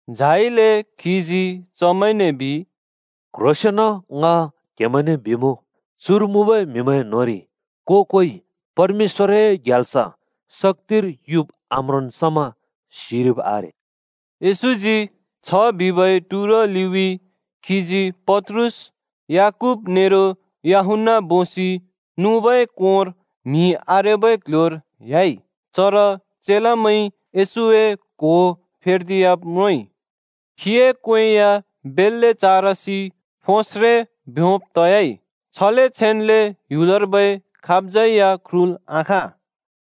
झाइले खीजी चमैंने बिइ, “क्ह्रोंसेंन ङ क्हेमैंने बिमुँ, चुर मुँबै म्‍हिमैं न्‍होंरि को-कोइ परमेश्‍वरए ग्याल्स शक्‍तिर युब् आम्रोंन् समा सिरिब् आरे।” येशूजी छ बिबै टुरो लिउँइँ खीजी पत्रुस, याकूब नेरो यूहन्‍ना बोसि नुबै कोंर म्हि आरेबै क्ल्ह्‍योर ह्‍याइ, चर चेलामैंइ येशूए क्हो फेर्दियाब् म्रोंइ। खीए क्‍वें या बेल्‍ले चारसि फोस्रे ब्योंब् तयाइ, छले छेन्ले ह्‍युलर्बै खाबज्यै या ख्रुल् आखाँ।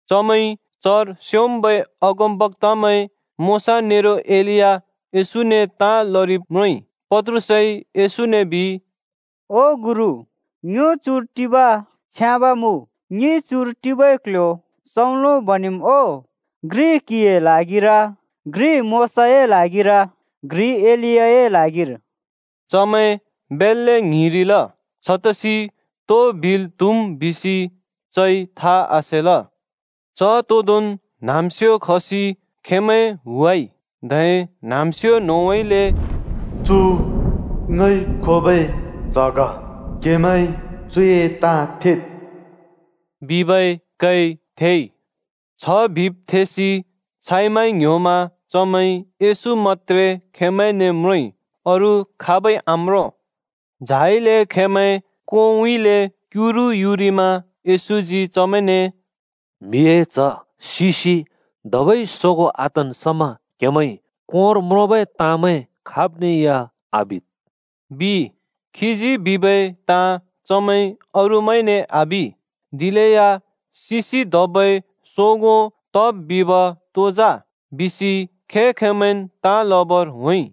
चमैंइ चर स्‍योंम्‍बै अगमबक्‍तामैं मोशा नेरो एलिया येशूने ताँ लरिब् म्रोंइ। पत्रुसइ येशूने बिइ, “ओ गुरु, ङ्यो चुर टिब छ्याँब मुँ! ङिइ चुर टिबै क्ल्ह्‍यो सौंलो बनेम् ओ? घ्रि क्‍हिए ल्हागिर, घ्रि मोशाए ल्हागिर, घ्रि एलियाए ल्हागिर।” चमैं बेल्‍ले ङ्हिंरिल। छतसि तो बिल् त्‍हुम् बिसि चइ था आसेल। च तोदोंन् न्‍हाँम्‍स्यो खसि खेंमैं हुवाइ, धै न्हाँम्स्यो न्होंउँइँले “चु ङइ खोबै च्‍ह ग, क्‍हेमैंइ चुए ताँ थेद् बिबै कै थेइ।” छ बिब् थेसि छाइ माइ ङ्‌ह्‍योमा चमैंइ येशू मत्‍त्रे खेंमैंने म्रोंइ अरू खाबै आम्रों। झाइले खेंमैं कोंउँइँले क्‍युरु युरिमा येशूजी चमैंने “म्हिए च्ह सिसि धबै सोगों आतन् समा क्हेमैंइ कोंर म्रोंबै ताँमैं खाब्ने या आबिद् ओ,” बिइ। खीजी बिबै ताँ चमैंइ अरूमैंने आबि, दिलेया सिसि धबै सोगों तब् बिब तो जा? बिसि खें-खेंमैंन् ताँ लबर होंइ।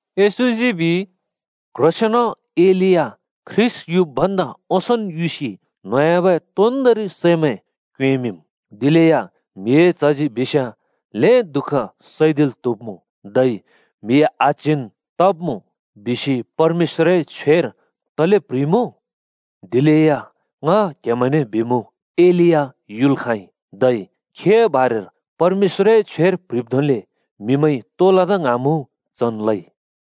येशूजी बिइ, “क्‍ह्रोंसेंन ख्रीष्‍ट युब् भन्दा ओंसोंन् एलिया युसि न्होंयाबै तोन्दोंरि सैमैं क्योंएँमिंम्। दिलेया म्हिए च्हजी बिस्याँ ल्‍हें दुःख सैदिल् त्‍हुब्मुँ, धै म्हि आच्हिन् तब्मुँ बिसि परमेश्‍वरए छ्वेर तले प्ह्रिइमुँ? दिलेया ङ क्हेमैंने बिमुँ, एलिया युल् खाँइ, धै खीए बारेर परमेश्‍वरए छ्वेर प्‍ह्रिब् धोंले म्हिमैंइ तो लदा ङ्हाँमुँ चन् लइ।”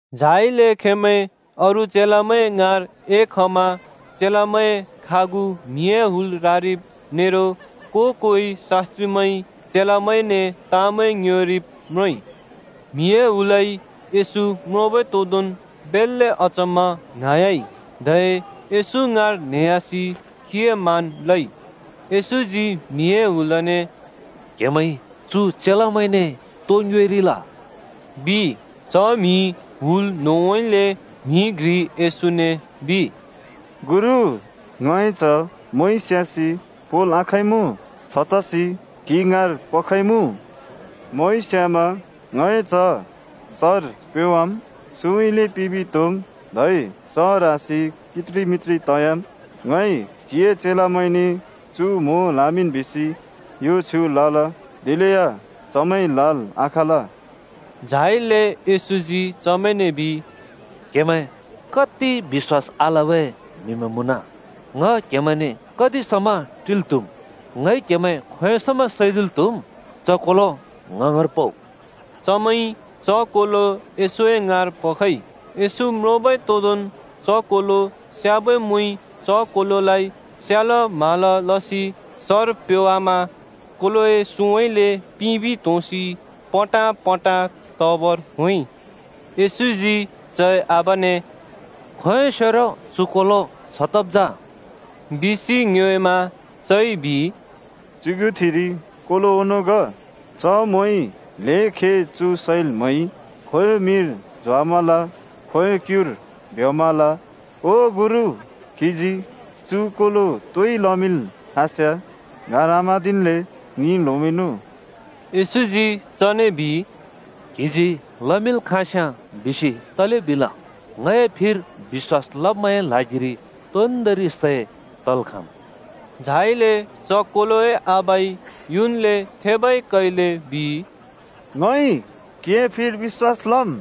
झाइले खेंमैं अरू चेलामैं ङाँर एखमा चेलामैंए खागु म्हिए हुल रारिब नेरो को-कोइ शास्‍त्रिमैंइ चेलामैंने ताँमैं ङ्योएरिब् म्रोंइ। म्हिए हुलइ येशू म्रोंबै तोदोंन् बेल्‍ले अचम्‍मा ङ्हाँह्‍याइ, धै येशू ङाँर न्हेह्‍यासि खीए मान लइ। येशूजी म्हिए हुलने “क्‍हेमैंइ चु चेलामैंने तो ङ्योएरिल?” बिइ। च म्हि हुल न्‍होंउँइँले म्‍हि घ्रिइ येशूने बिइ, “गुरु, ङए च्‍ह मोंइ स्‍यासि पोंल् आखाँइँमुँ। छतसि क्‍हि ङाँर पखइमुँ। मोंइ स्‍यामा ङए च्ह सर प्योवाम्, सुँउँइँले पिबि त्होंम्, धै स ह्रासि कित्रि मित्रि तयाम्। ङइ क्‍हिए चेलामैंने चु मों ल्‍हामिंन् बिसि यो छ्युँ लल। दिलेया चमैंइ ल्हाल् आखाँल।” झाइले येशूजी चमैंने बिइ, “च्या, क्‍हेमैं कति बिश्‍वास आलबै म्‍हिमैं मुँन! ङ क्‍हेमैंने कति समा टिल् त्‍हुम्? ङइ क्‍हेमैं खोंयों समा सैदिल् त्‍हुम्? च कोलो ङ ङाँर पउ।” चमैंइ च कोलो येशूए ङाँर पखइ। येशू म्रोंबै तोदोंन् च कोलो स्‍याबै मोंइ च कोलोलाइ स्याल म्हाल लसि सर प्योवामा कोलोए सुँउँइँले पिबि त्होंसि पटाँपटाँ तबर होंइ। येशूजी चए आबाने “खोंयोंसेरो चु कोलो छ तब् जा?” बिसि ङ्योएमा चइ बिइ, “च्‍युगुथिरि कोलो ओंनों ग। च मोंइ ल्‍हें खे चु सैल् म्हैइ। खोंयों मिर झोंवामल, खोंयों क्‍युर भ्‍योंवामल। ओ गुरु, क्‍हिजी चु कोलो तोइ लमिंल् खाँस्‍याँ गार आम्हाँदिल्‍ले ङि ल्होमिंनु।” येशूजी चने बिइ, “‘क्‍हिजी लमिंल् खाँस्याँ’ बिसि तले बिल? ङए फिर बिश्‍‍वास लब्मैंए ल्हागिर तोन्दोंरि सै तल् खाँम्।” झाइले च कोलोए आबाइ युन्ले थेबै कैले बिइ, “ङइ क्हिए फिर बिश्‍वास लम्,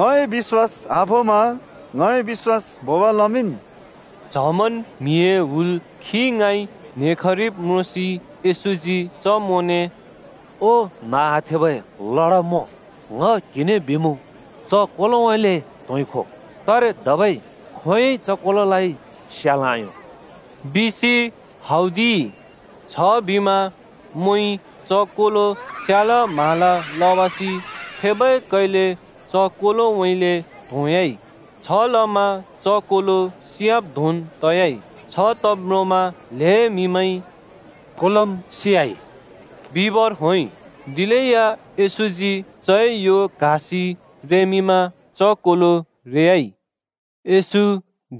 ङए बिश्‍वास आभोंमा ङए बिश्‍वास भोंब लमिंन्।” च्हमन् म्हिए हुल खी ङाँइ न्हेखरिब् म्रोंसि येशूजी च मोंने “ओ न्‍ह आथेबै लडा मों, ङ क्‍हिने बिमुँ, च कोलोउँइँले त्‍होंखो, तारे धबै खोंयोंइ च कोलोलाइ स्याल् आयों बिसि,” हौदिइ। छबिमा मोंइ च कोलो स्यालाम्हाला लवासि थेबै कैले च कोलोउँइँले त्‍होंह्‍याइ। छलमा च कोलो सियाब् धोंन् तयाइ। छ तब् म्रोंमा ल्‍हें म्‍हिमैंइ “कोलोम् सियाइ बिबर,” होंइ। दिलेया येशूजी चए यो क्‍हासि रेमिंमा च कोलो सोगों तयाइ। येशू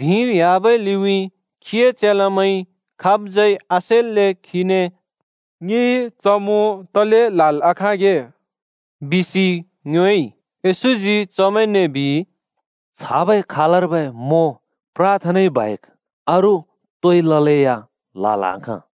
धिंर ह्‍याबै लिउँइँ खीए चेलामैंइ खाबज्यै आसेल्‍ले खीने “ङिइ च मों तले ल्‍हाल् आखाँगे?” बिसि ङ्योएइ। येशूजी चमैंने बिइ, “छाबै खालर्बै मों प्राथनाइ बाहेक अरू तोइ ललेया ल्‍हाल् आखाँ।”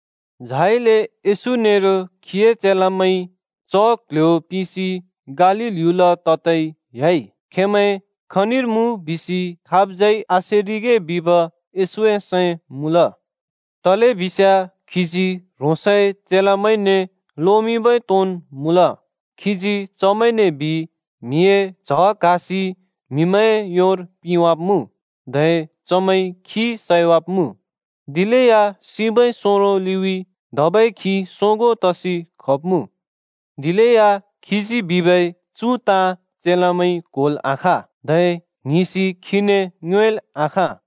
झाइले येशू नेरो खीए चेलामैं च क्‍ल्‍ह्‍यो पिसि गालील ह्‍युल ततै ह्‍याइ। खेंमैं खनिर मुँ बिसि खाबज्यै आसेरिगे बिब येशूए सैं मुँल, तलेबिस्याँ खीजी ह्रोंसए चेलामैंने लोमिंबै तोंन् मुँल। खीजी चमैंने बिइ, म्हिए च्ह क्हासि म्‍हिमैंए योर पिंवाब्मुँ, धै चमैंइ खी सैवाब्‍मुँ, दिलेया सिबै सोंरो लिउँइँ धबै खी सोगों तसि खब्मुँ। दिलेया खीजी बिबै चु ताँ चेलामैंइ क्‍होल् आखाँ, धै ङ्हिंसि खीने ङ्योएल् आखाँ।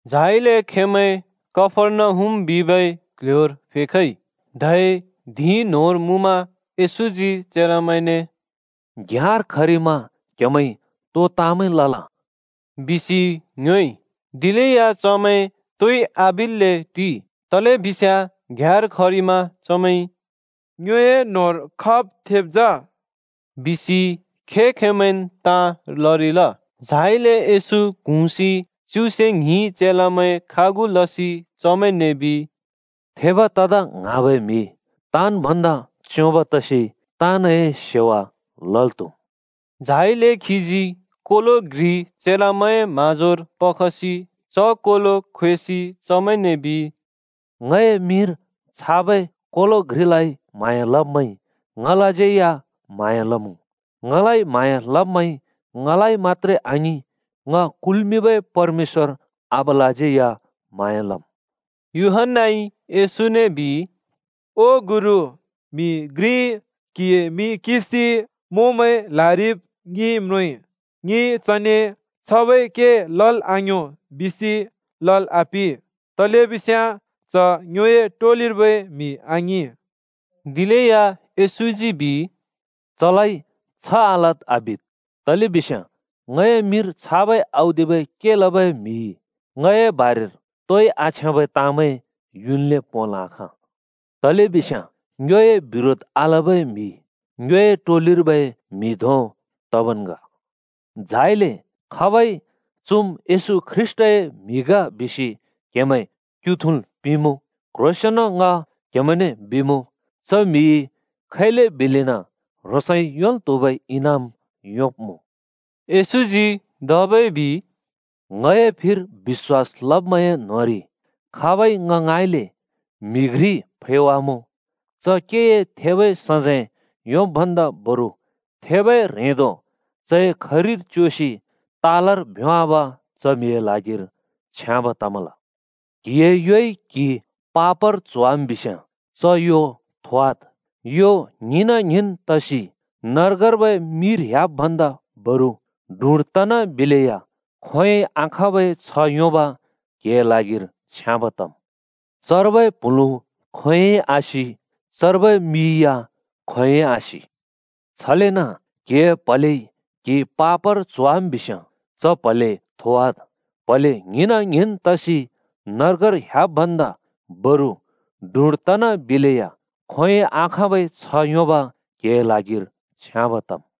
झाइले खेंमैं कफर्नहुम बिबै क्ल्ह्‍योर फेखइ, धै धिं न्‍होंर मुँमा येशूजी चेलामैंने “घ्‍याँर खरिमा क्‍हेमैंइ तो ताँमैं लल?” बिसि ङ्योएइ। दिलेया चमैं तोइ आबिल्‍ले टिइ, तलेबिस्याँ घ्‍याँर खरिमा चमैंइ “ङ्योए न्‍होंर खाब् थेब् जा?” बिसि खें-खेंमैंन् ताँ लरिल। झाइले येशू क्हुँसि च्युसे ङ्हिं चेलामैं खागु लसि चमैंने बिइ, “थेब तदा ङ्हाँबै म्‍हि, ताँन् भन्दा च्‍योंब् तसि ताँनए सेवा लल् त्‍हुम्।” झाइले खीजी कोलो घ्रि चेलामैंए म्‍हाँजोर पखसि च कोलो ख्वेसि चमैंने बिइ, “ङए मिंर छाबै कोलो घ्रिलाइ म्हाँया लब्मैंइ, ङलाज्यै म्हाँया लमुँ। ङलाइ म्हाँया लब्मैंइ ङलाइ मत्‍त्रे आङिं, ङ कुल्‍मिंबै परमेश्‍वर आबालाज्यै या म्हाँया लम्।” यूहन्‍नाइ येशूने बिइ, “ओ गुरु, म्‍हि घ्रिइ क्‍हिए मिं किंसि मोंमैं ल्‍हारिब ङिइ म्रोंइ। ङिइ चने ‘छाबै के लल् आयों’ बिसि लल् आपिं, तलेबिस्याँ च ङ्योए टोलिर्बै म्‍हि आङिंल।” दिलेया येशूजी बिइ, “चलाइ छ आलद् आबिद्, तलेबिस्याँ ङए मिंर छाबै औदिबै के लबै म्‍हिइ ङए बारेर तोइ आछ्याँबै ताँमैं युन्ले पोंल् आखाँ। तलेबिस्याँ ङ्योए बिरोध आलबै म्हि ङ्योए टोलिर्बै म्‍हि धों तबन् ग। झाइले खाबइ ‘चुम् येशू ख्रीष्‍टए म्‍हि ग’ बिसि क्‍हेमैं क्‍यु थुँल् पिंलेया, क्‍ह्रोंसेंन ङइ क्‍हेमैंने बिमुँ, च म्‍हिइ खैले बिलेन ह्रोंसइ योंल् त्‍हुबै इनाम योंब्मुँ।” येशूजी धबै बिइ, “ङए फिर बिश्‍वास लब्‍मैंए न्‍होंरि खाबइ ङ ङाँइँले म्हि घ्रि फ्रेवामुँ, च केए थेबै सजैं योंब् भन्दा बरु थेबै ह्रेंदो चए खरिर च्‍योसि तालर भ्‍योंवाब च म्‍हिए ल्हागिर छ्याँब तमल। क्हिए योइ क्‍हि पापर च्होवाम् बिस्‍याँ च यो थोवाद्। यो ङ्हिंन ङ्हिंन् तसि नर्गर्बै मिर ह्‍याब् भन्दा बरु डुँड तनाबिलेया खोंयोंइ आखाँबै छह् योंब क्हिए ल्हागिर छ्याँब तम्। [चर्बै प्हुलुँ खोंयोंइ आसि, चर्बै मि या खोंयोंइ आसि।] छलेन क्‍हिए प्‍हलेइ क्‍हि पापर च्होवाम् बिस्‍याँ, च प्‍हले थोवाद्। प्‍हले ङ्हिंन ङ्हिंन् तसि नर्गर ह्‍याब् भन्दा बरु डुँड तनाबिलेया खोंयोंइ आखाँबै छह् योंब क्हिए ल्हागिर छ्याँब तम्।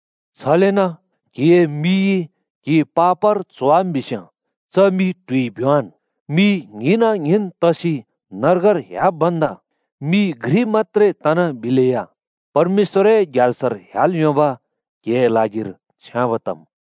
छलेन क्‍हिए मिइ क्‍हि पापर च्होवाम् बिस्‍याँ, च मि ट्हुइ भ्‍योंवान्। मि ङ्हिंन ङ्हिंन् तसि नर्गर ह्‍याब् भन्दा मि घ्रि मत्‍त्रे तनाबिलेया परमेश्‍वरए ग्याल्सर ह्‍याल् योंब क्हिए ल्हागिर छ्याँब तम्।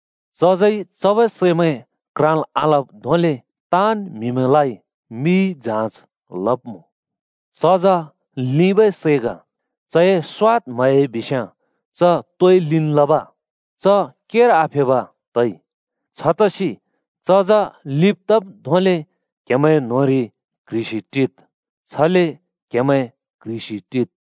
“चजइ चबै सैमैं क्राँल् आलब् धोंले ताँन् म्‍हिमैंलाइ मिइ जाँच लब्मुँ। चज लिंबै सै ग, चए स्वाद् म्हह्‍याइ बिस्याँ च तोइ लिंन् लब? च केर आफेब तइ। छतसि चज लिंब् तब् धोंले क्‍हेमैंए न्होंरि क्ह्रिसि टिद्। छले क्‍हेमैं क्ह्रिसि टिद्।”